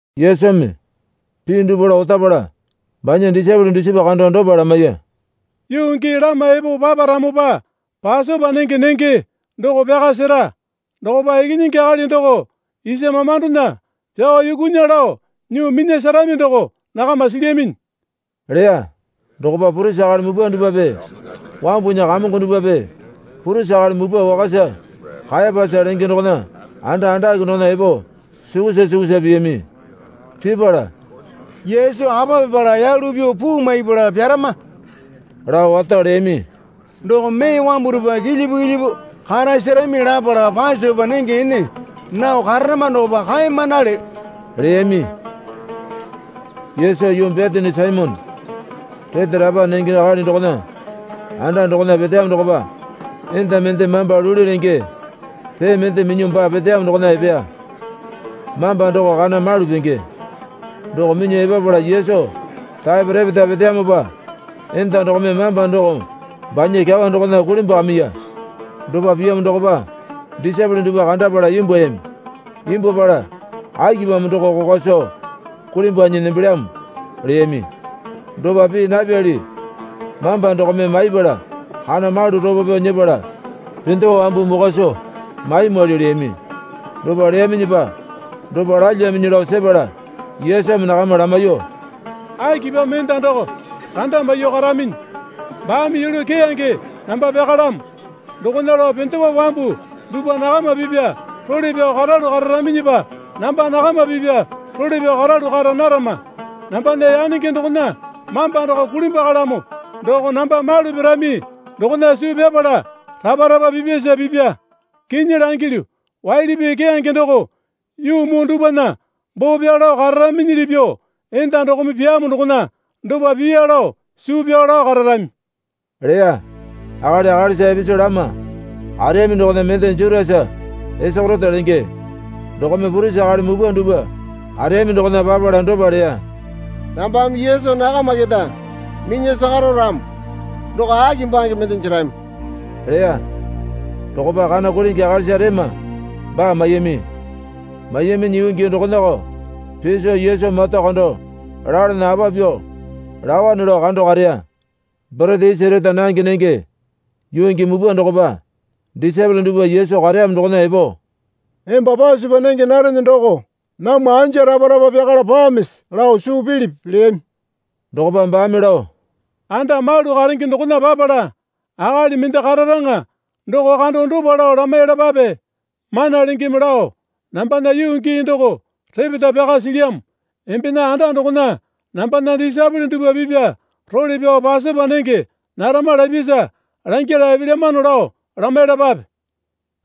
Yesumi pii dupwa lao otapala banya disaepole dusipa kando dopa lamaiya. Yuu gii lama epo paparamopa Pasopa nenge nenge doko pyaka sera. Dokopa Ikinyingi Akali doko isa mamandona pyao yukunya lao nyuo minya serami doko nakama silyaminyi, leya. Dokopa purisi akali mupwa dupwape wambunya kamongo dupwape purisi akali mupwa wakasa Kayapasa lenge dokona anda andake dokona epo sukusa sukusa piyami. Pipala, Yesu apa pipala yalu pyuo puu maipala pyarama, lao wato leyami. Doko mee wambu dupwa kilyipu kilyipu karasarami lapala Pasopa nenge ene nao kararama dokopa kaeyamanale, leyami. Yesu yuu Betani Saimone rete rapa nenge akali dokona anda dokona peteyamo dokopa enda mende mamba luli lenge pee mende minyuo baa peteyamo dokona epeya. Mamba doko kana malu penge. Doko minyuo epapala Yesu taepo repeta peteyamopa enda dokome mamba doko banya kyawa dokona kulimbwakamiya. Dopa piyamo dokopa disaepole dupwa kandapala imbwuayami. Imbwuapala, Akipamo doko kokwa soo kulimbwanyi nembelyamo? leyami. Dopa pii napyali mamba dokome maipala kana malu ropo pyao nyepala pendewa wambu mokwa soo maimwali, leyami. Dopa leyaminyipa dopa lalyaminyi lao sepala Yesumi nakama lamaiyuo, Akipamo enda doko randa maiyuo karaminyi? Baame yulu keyange namba pyakalamo. Dokona lao pendewa wambu dupwa nakama pipya role pyao karalu kararaminyipa namba nakama pipya role pyao karalu kara narama. Nambana yanenge dokona mamba doko kulimbwakalamo doko namba malu pirami dokona suu pyapala rapa rapa pipyasa pipya. Kinyi langilyu, waili pii keyange doko yuu muu dupwana boo pyao lao kararaminyili pyuo enda dokome pyamo dokona dopa piya lao suu pyao lao kararami, leya. Akali akalisa ipisu lama kareyami dokona mende Jutasa Isakeriote lenge dokome purisi akali mupwa dupwa kareyami dokona papala dopa leya. Nambame Yesu nakama keta minya sakaro ramo doko aki bange mende jerami, leya. Dokopa kana kulingi akalisa rema baa maiyami. Maiyaminyi yuu gii dokonako piso Yesu mata kando lalana apa pyuo laowane lao kando kareya. Borete isi reta nange nenge yuu gii mupwa dokopa disaepole dupwa Yesu kareyamo doko epo, Emba Pasopa nenge narene doko namwa anja rapa rapa pyakala pamisi lao suu pilipi? leyami. Dokopa baame lao, Anda malu karenge dokona papala akali mende kararaŋa doko kando dopa lao lamaiyalapape. Mana Lengeme lao, Nambana yuu gii doko repeta pyaka silyamo. Embena anda dokona nambana disaepole dupwa pipya role pyao Pasopa nenge narama, lapyasa langyala epelyamano lao lamaiyalapape,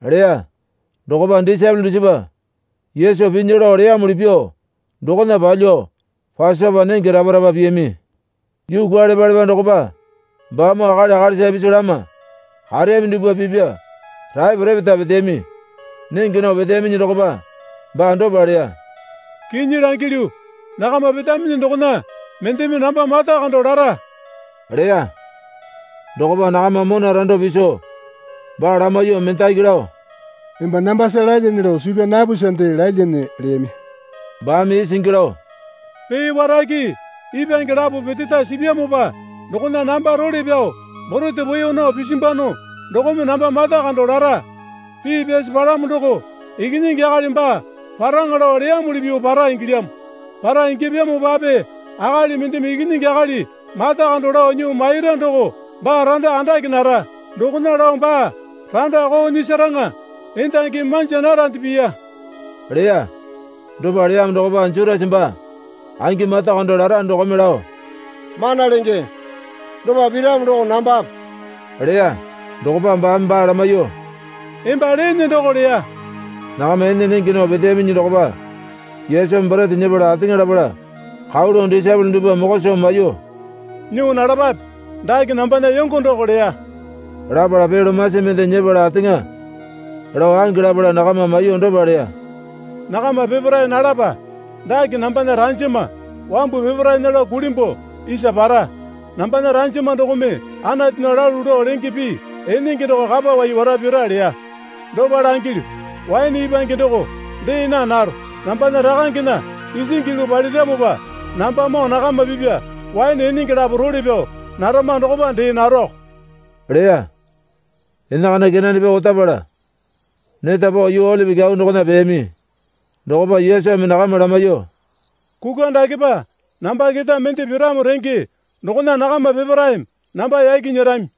leya. Dokopa disaepole dusipa Yesu pinya lao leyamuli pyuo dokona palyuo Pasopa nenge rapa rapa piyami. Yuu kwualepalepa dokopa baamoo akali akalisa ipisu lama kareyami dupwa pipya taepo repeta peteyami. Nenge nao peteyaminyi dokopa baa dopa leya. Kinyi langilyu, nakama petaminyi dokona mendeme namba mata kando lara, leya. Dokopa nakama mona rando piso baa lamaiyuo mendaki lao, Emba nambasa lalyane lao suu pyaa napusande lalyane, leyami. Baame isingi lao, Pee warake ipwange lapo peteta sipyamopa dokona namba role pyao borete poeyo nao pisimbwano dokome namba mata kando lara. Pii pyasi palamo doko, Ikinyingi Akali baa paraŋa lao leyamuli pyuo para ingilyamo. Para ingyapyamopape akali mendeme Ikinyingi Akali mata kando lao nyuo maira doko baa randa andake nara. Dokona lao baa randa koo nyisaraŋa endangimi manja narande piya, leya. Dopa leyamo dokopa Jutasa baa angi mata kando lara dokome lao, Mana Lenge, dopa piramo doko nambape? leya. Dokopa baame baa lamaiyuo, Emba leene doko leya. Nakama ene nenge nao peteyaminyi dokopa Yesumi borete nyepala ateŋa lapala kau lao disaepole dupwa mokwa soo maiyuo, Nyuo nalapape. Dake nambana yongo doko leya. Lapala pee lomasi mende nyepala ateŋa lao ange lapala nakama maiyuo dopa leya, Nakama peparae nalapa. Dake nambana ranjama wambu peparaena lao kulimbuo isa para. Nambana ranjama dokome Anatunya lalu lao lenge pii enenge doko kapawai wara pira leya. Dopa langilyu, waene ipwange doko dee naa naro. Nambana Rakangena isingi yulu paliramopa nambamoo nakama pipya waene enenge lapo role pyao narama dokopa dee naroko leya. Enakana kenane pyao otapala neta pao yuu Olipi Kyau dokona peyami. Dokopa Yesumi nakama lamaiyuo, Kukwa dakepa namba keta mende piramo renge dokona nakama peparaeme namba yaki nyerami.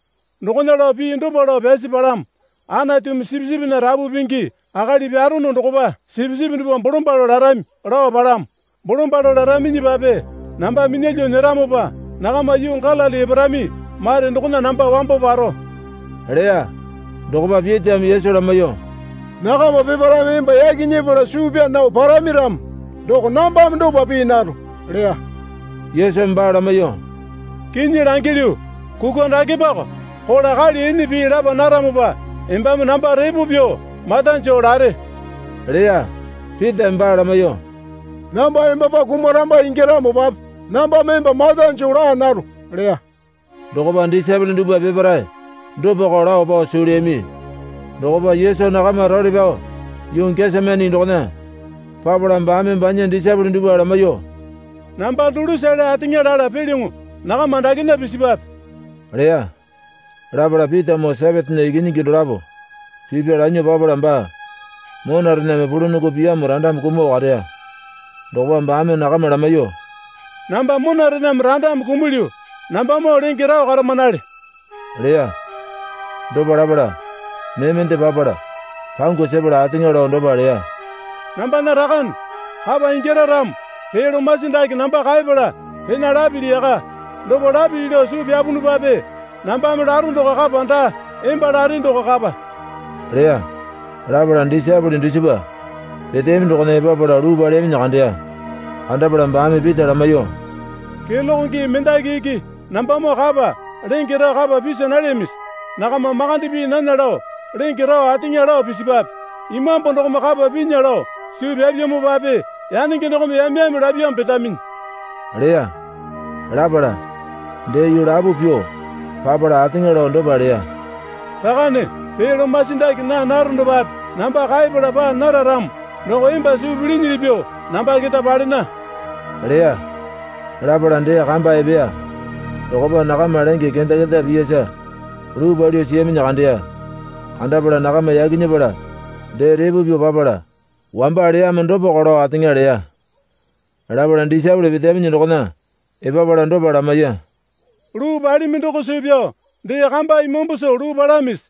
Dokona lao pii dopa lao pyasi palamo. Anatumi sipisipinya rapu pingi akali pyarono dokopa sipisipi dupwa bolombalo larami, lao palamo. Bolombalo laraminyipape namba minyalyuo nyeramopa nakama yuu Galili eparami mare dokona namba wambo paro leya. Dokopa Pitame Yesu lamaiyuo, Nakama peparaeme emba yaki nyepala suu pyaa nao parami ramo doko nambame dopa pii naro, leya. Yesumi baa lamaiyuo, Kinyi langilyu, kukwa dakepako kola kali ene pii lapa naramopa embame namba repo pyuo mata joo lare, leya. Pitame baa lamaiyuo, Namba embapa kumaramba ingyaramopape nambame emba mata joo laa naro leya. Dokopa disaepole dupwa peparae dopako lao pao suu leyami. Dokopa Yesu nakama role pyao yuu Gesemani dokona papala baame banya disaepole dupwa lamaiyuo, Namba dulusale ateŋa lala pelyoŋo nakama dakena pisipwape, leya. Lapala Pitamoo Sepetena ikinyingi dolapo pipya lanyuo papala baa monarename pulunongo piyamo randame kumuo kareya. Dokopa baame nakama lamaiyuo, Namba monarename randame kumulyu. Nambamoo lenge rao karamanale, leya. Dopa lapala mee mende papala pangu sepala ateŋa lao dopa leya. Nambana Rakane, kapa ingyara ramo pee lomasi dake namba kaepala pena lapili yaka. Dopa lapili lao suu pyapunupape nambame laro doko kapa daa, emba lare doko kapa, leya. Lapala disaepole dusipa peteyami dokona epapala luu paleyaminyi kandeya. Kandapala baame Pita lamaiyuo, Keloke gii mendaki iki nambamoo kapa lenge rao kapa pisa nalyamisi? Nakama makande pii nana lao lenge rao ateŋa lao pisipwape. Imambu dokome kapa pinya lao suu pyapyamopape yanenge dokome yame yame lapyamo petaminyi, leya. Lapala dee yuu lapo pyuo papala ateŋa lao dopa leya. Rakane, pee lomasi dake naa naronopape namba kaepala paa nara ramo doko emba suu pilinyili pyuo namba keta palena, leya. Lapala dee kamba epeya. Dokopa nakama lenge kenda kenda piyasa luu palyuo siyaminyi kandeya. Kandapala nakama yaki nyepala dee repo pyuo papala wamba leyamo dopako lao ateŋa leya. Lapala disaepole peteyaminyi dokona epapala dopa lamaiya. Luu palimi doko suu pyao dee kamba imambu soo luu palamisi?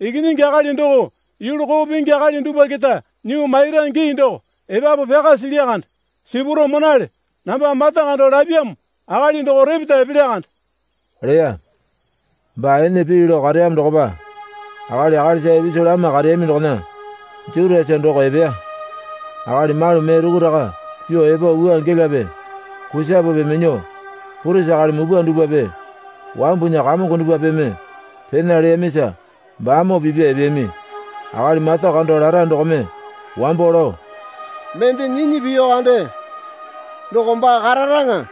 Ikinyingi Akali doko yulu koo pingi akali dupwa keta nyuo maira gii doko epapu pyaka silya kande. Sipuro monale. Namba mata kando lapyamo akali doko repeta epelya kande, leya. Baa ene pii lao kareyamo dokopa akali akalisa ipisu lama kareyami dokona Jutasa doko epeya. Akali malu mee rukuraka pyuo epo wua gelape kusapepe minyuo purisi akali mupwa dupwape wambunya kamongo dupwapeme pena leyamisa baamoo pipya epeyami. Akali mata kando lara dokome wambo lao, Mende nyinyi piyu kande doko baa kararaŋa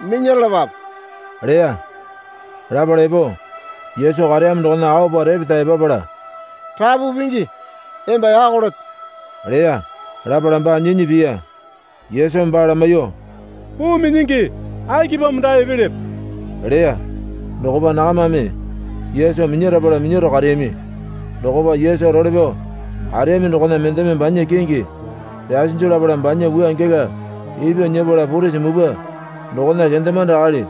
minyaralapape leya. Lapala epo Yesu kareyamo dokona aopa repeta epapala, Rapu Pingi emba yako leto leya. Lapala baa nyinyi piya. Yesumi baa lamaiyuo, Puu minyingi, akipamo dae epelepe? leya. Dokopa nakamame Yesu minyarapala minyaro kareyami. Dokopa Yesu role pyao kareyami dokona mendeme banya kingi pyasinju lapala banya wua gela ipyuo nyepala purisi mupwa dokona kendemande akali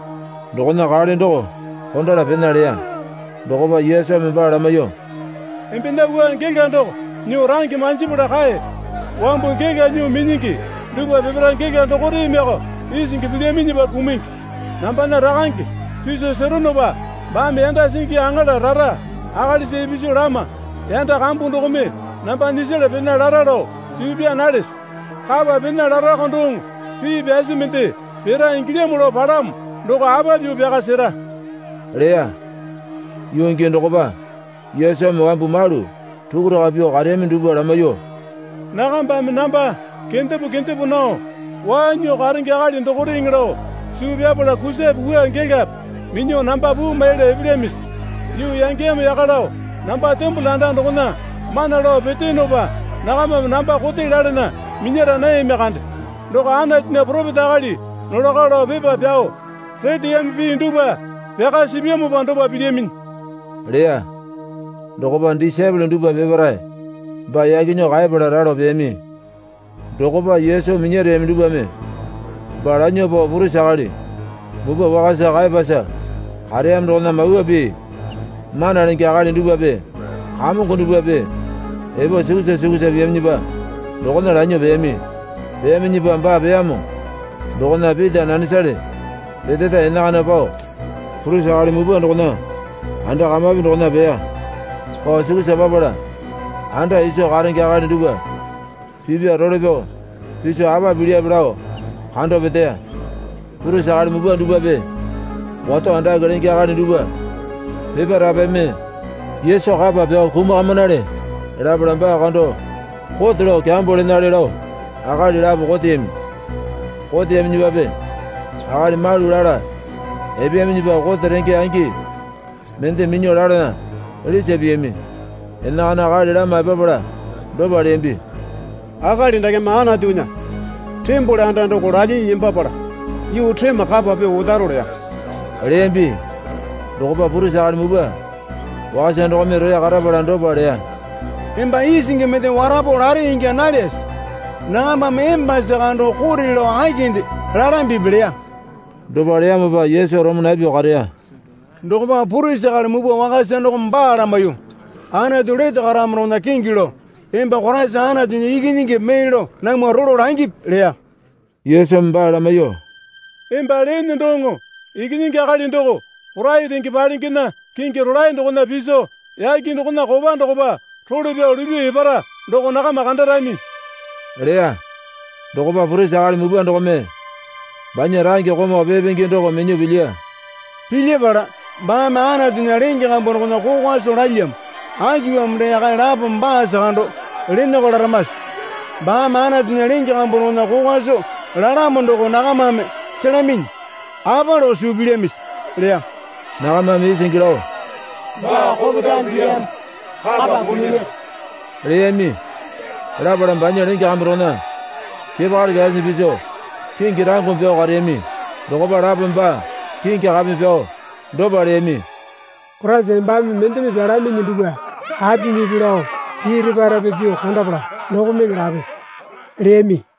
dokona kale doko kondala pena leya. Dokopa Yesumi baa lamaiyuo, Embena wua gela doko nyuo range manjipala kae. Wambu gela nyuo minyingi dupwa peparae gela dokoremeko isingi pilyaminyipa kumungi. Nambana Rakange piso seronopa baame yanda singi aŋala rara akalisa ipisu lama yanda kambu dokome namba nyisala pena lara lao suu pyaa nalese? Kapa pena larako doŋo pii pyasi mende pira ingilyamo lao palamo doko apa pyuo pyaka sera? leya. Yuu gii dokopa Yesumi wambu malu rukuraka pyuo kareyami dupwa lamaiyuo, Nakambame namba kendepo kendepo nao waa nyuo karenge akali dokoreŋe lao suu pyapala kusape wua gelape minyuo namba puu maiyala epelyamisi? Yuu yangeyamo yaka lao namba tembole anda dokona mana lao peteyonopa nakamame namba kote lalana minyara nayami kande. Doko Anatunya poropeta akali nolako lao pepa pyao reteyami pii dupwa pyaka sipyamopa dopa pilyaminyi leya. Dokopa disaepole dupwa peparae baa yaki nyuo kaepala ralo peyami. Dokopa Yesu minyareyami dupwame baa lanyuo pao purisi akali mupwa wakasa Kayapasa kareyamo dokona Mawa Pii mana lenge akali dupwape kamongo dupwape epo sukusa sukusa piyaminyipa dokona lanyuo peyami. Peyaminyipa baa peyamo dokona Pita nanesale peteta enakana pao purisi akali mupwa dokona anda kamapi dokona peya. Pao sukusa papala anda iso karenge akali dupwa pipya role pyao piso apa pipelyape lao kando peteya. Purisi akali mupwa dupwape wato andake lenge akali dupwa peparaepeme Yesu kapa pyao kumakamanale lapala baa kando kote lao kyambo lenale lao akali lapo koteyami. Koteyaminyipape akali malu lala epeyaminyipa kote renge angi mende minyuo lalana lisa piyami. Enakana akali lama epapala dopa leyambi. Akali dakeme Anatunya tembole anda doko lalyinyi nembapala yuu rema kapa pyuo otaro, leya, leyambi. Dokopa purisi akali mupwa wakasa dokome roya karapala dopa leya. Emba isingi mende warapo lare ingya nalyase? Nakambame embasa kando kote lao akinde lalambipi? leya. Dopa leyamopa Yesu roma napyuo kareya. Dokopa purisi akali mupwa wakasa dokome baa lamaiyuo, Anatu lete karamo dokona kingi lao, Emba Koraisa Anatunya Ikinyingipi mee lao namwa rolo langipi, leya. Yesumi baa lamaiyuo, Emba leene doŋo Ikinyingi Akali doko Porai Renge Palengena kingi rolae dokona piso yake dokona kopa dokopa role pyao lupyuo epara doko nakama kandarami, leya. Dokopa purisi akali mupwa dokome banya range komau pee pingi doko minyuo pilyiya. Pilyapala, baame Anatunya lenge kambu dokona kokwa soo lalyamo. Akipamo dee akali lapome baasa kando lenako laramase? Baame Anatunya lenge kambu dokona kokwa soo lalamo doko nakamame selaminyi. Apa lao suu pilyamisi? leya. Nakamame isingi lao. Baa kopetame pilyamo kapa kumunya, leyami. Lapala banya lenge kambu dokona kepakali kyasinyi piso kingi rangome pyao kareyami. Dokopa lapome baa kingi kapeme pyao, dopa leyami. Koraisa embame mendeme pyalaminyi dupwa apimipi lao pii repa repa pyuo kandapala dokomeŋe lape leyami.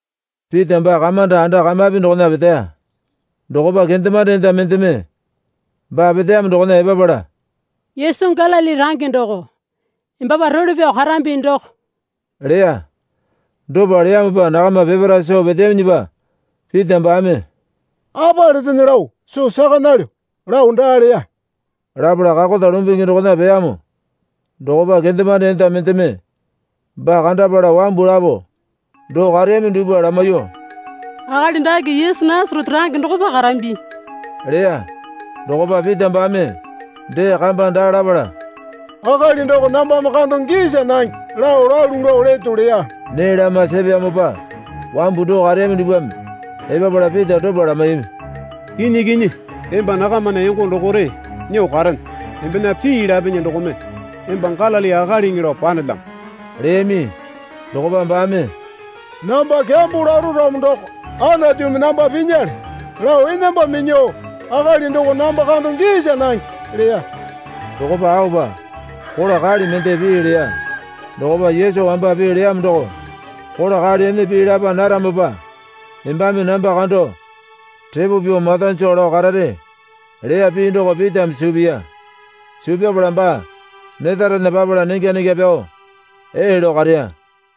Pita baa kamanda anda kamapi dokona peteya. Dokopa kendemande enda mendeme baa peteyamo dokona epapala, Yesu Galili range doko embapa role pyao karambi doko, leya. Dopa leyamopa nakama peparae soo peteyaminyipa Pita baame, Apa letene lao soo saka nalyo, lao daa leya. Lapala kakota lumbungi dokona peyamo dokopa kendemande enda mendeme baa kandapala wambu lapo doo kareyami dupwa lamaiyuo, Akali dake Yesu Nasarete range dokopa karambi, leya. Dokopa Pita baame dee kamba daa lapala, Akali doko nambame kando gisa nange lao lalu lao leto, leya. Nee lama sepeyamopa wambu doo kareyami dupwame epapala Pita dopa lamaiyami. Kinyi kinyi emba nakamana yongo dokore nyuo karene. Embena pii lapinyi dokome emba Galili akaliŋi lao panelyamo, leyami. Dokopa baame, Namba kyambo laro ramo doko Anatumi namba pinyale, lao enamba minyuo, akali doko namba kando gisa nange, leya. Dokopa aopa kola kali mende pii leya. Dokopa Yesu wamba pii leyamo doko, Kola kali ene pii lapa naramopa embame namba kando repo pyuo mata joo lao karare, leya pii doko Pitame suu piya. Suu pyapala baa netarena papala nengya nengya pyao, ee lao kareya.